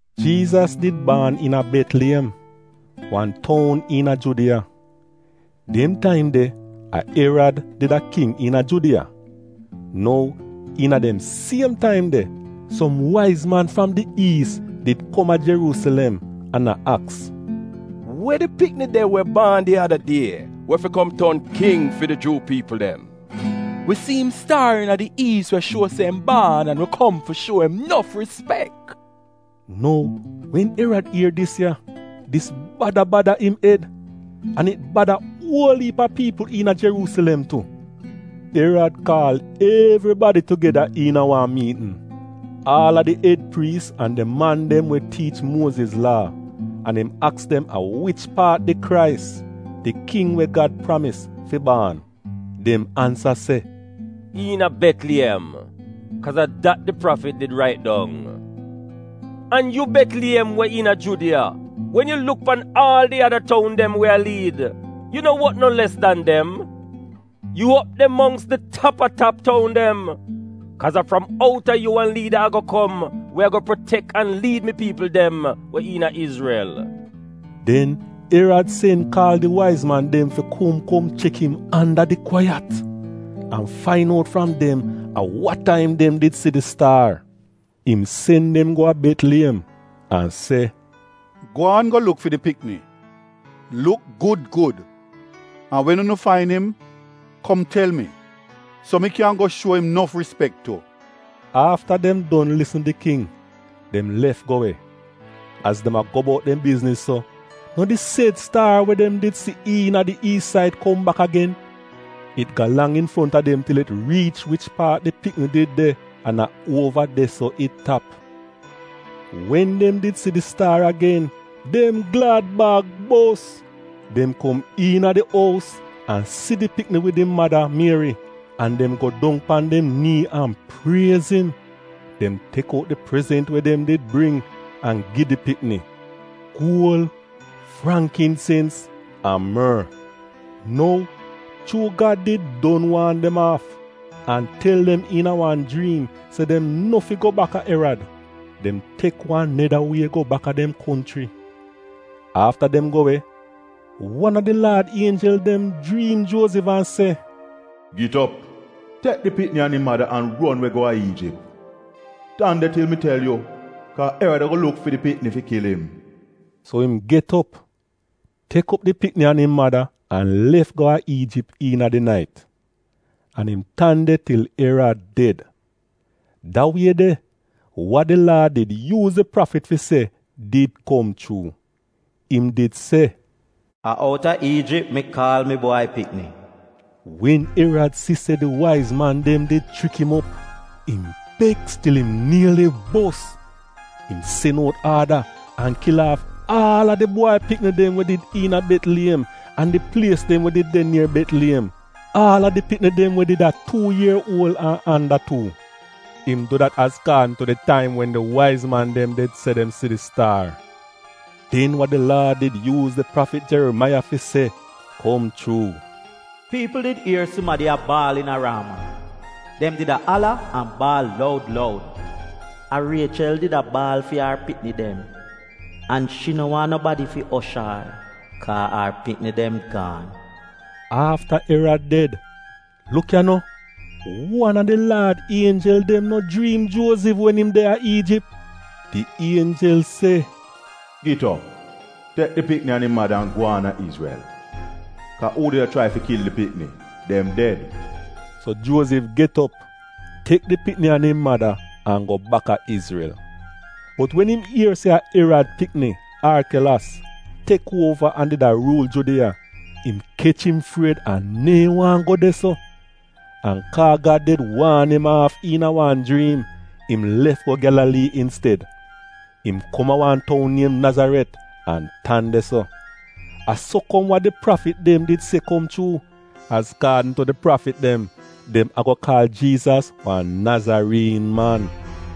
Jiizas did baan iina Betliyem, wan toun iina Judiya. Dem taim de, a Erad did a king iina Judiya. Nou, iina dem siem taim de, som waiz man fram di Iis said did kom a Jeruusilem an a aks, “We di pikni de we baan di ada die, we fi kom ton king fi di Juu piipl dem? Wi si im staar iina di Iis, we shuo se im baan, an wi kom fi shuo im nof rispek.” Nou wen King Erad ier dis ya, dis bada bada im ed, an it bada uol iip a piipl iina Jeruusilem tu. Erad kaal evribadi tugeda iina wan miitn — aal a di ed priis an di man dem we tiich Muoziz Laa — an im aks dem a wich paat di Krais — di king we Gad pramis, fi baan. Dem ansa se, “Iina Betliyem, kaaz a dat di prafit did rait dong: ‘An yu Betliyem we iina Judiya, wen yu luk pan aal di ada toun dem we a liid, yu no wot no les dan dem — yu op de mongks di tap-a-tap toun dem; kaaz a fram out a yu wan liida ago kom we ago protek an liid mi piipl dem we iina Izrel.’” Den Erad sen kaal di waiz man dem fi kom kom chek im anda di kwaiyat, an fain out fram dem a wa taim dem did si di staar. Im sen dem go a Betliyem an se, “Gwaan go luk fi di pikni. Luk gud gud, an wen unu fain im, kom tel mi, so mi kyan go shuo im nof rispek tu.” Afta dem don lisn di king, dem lef go we. Az dem a go bout dem bizniz so, no di sed staar we dem did si iina di Iis said kom bak agen! It galang infronta dem til it riich wich paat di pikni did de, an a uova de-so it tap. Wen dem did si di staar agen dem glad-bag bos! Dem kom iina di ous an si di pikni wid im mada, Mieri, an dem go dong pan dem nii an priez im. Dem tek out di prezent we dem did bring, an gi di pikni — guol, frangkinsens an mor. Nou, chuu Gad did don waan dem aaf, an tel dem iina wan jriim se dem no fi go bak a Erad, dem tek wan neda wie go baka dem konchri. Afta dem go we, wan a di Laad ienjel dem jriim Juozif an se, “Git op! Tek di pikni an im mada an ron we go a Iijip. Tan de til mi tel yu, kaa Erad ago luk fi di pikni fi kil im.” So im get op, tek op di pikni an im mada an lef go a Iijip iina di nait. An im tan de til Erad ded. Da wie de, wa di Laad did yuuz di prafit fi se did kom chuu. Im did se, “A outa Iijip mi kaal mi bwai pikni.” Wen Erad si se di waiz man dem did chrik im op, im beks til im nieli bos! Im sen out aada, an kil aaf aal a di bwai pikni dem we did iina Betliyem an di plies dem we did de nier Betliyem, aal a di pikni dem we did a tuu ier uol an anda tuu. Im du dat azkaadn tu di taim wen di waiz man did se dem si di staar. Den wa di Laad did yuuz di prafit Jerimaiya fi se, kom chuu: “Piipl did ier sumadi a baal iina Raama, dem did a ala an baal loud loud, A Riechel did a baal fi ar pikni dem, an shi no waahn nobadi fi osh ar, kaa ar pikni dem gaan.” Afta Erad ded, luk ya no: wan a di Laad ienjel dem no jriim Juozif wen im de a Iijip. Di ienjel se, “Git op, tek di pikni an im mada an gwaan a Izrel, kaa uu did a chrai fi kil di pikni, dem ded.” So Juozif get op, tek di pikni an im mada an go bak a Izrel. Bot wen im ier se a Erad pikni, Arkelos, tek uova an did a ruul Judiya, im kech im fried an neehn waahn go de-so. An kaa Gad did waan im aaf iina wan jriim, im lef go Gyalalii insted. Im kom a wan toun niem Nazaret an tan de-so. A so kom wa di prafit dem did se kom chuu. Azkaadn tu di prafit dem, dem ago kaal Jiizas wan Nazariin man.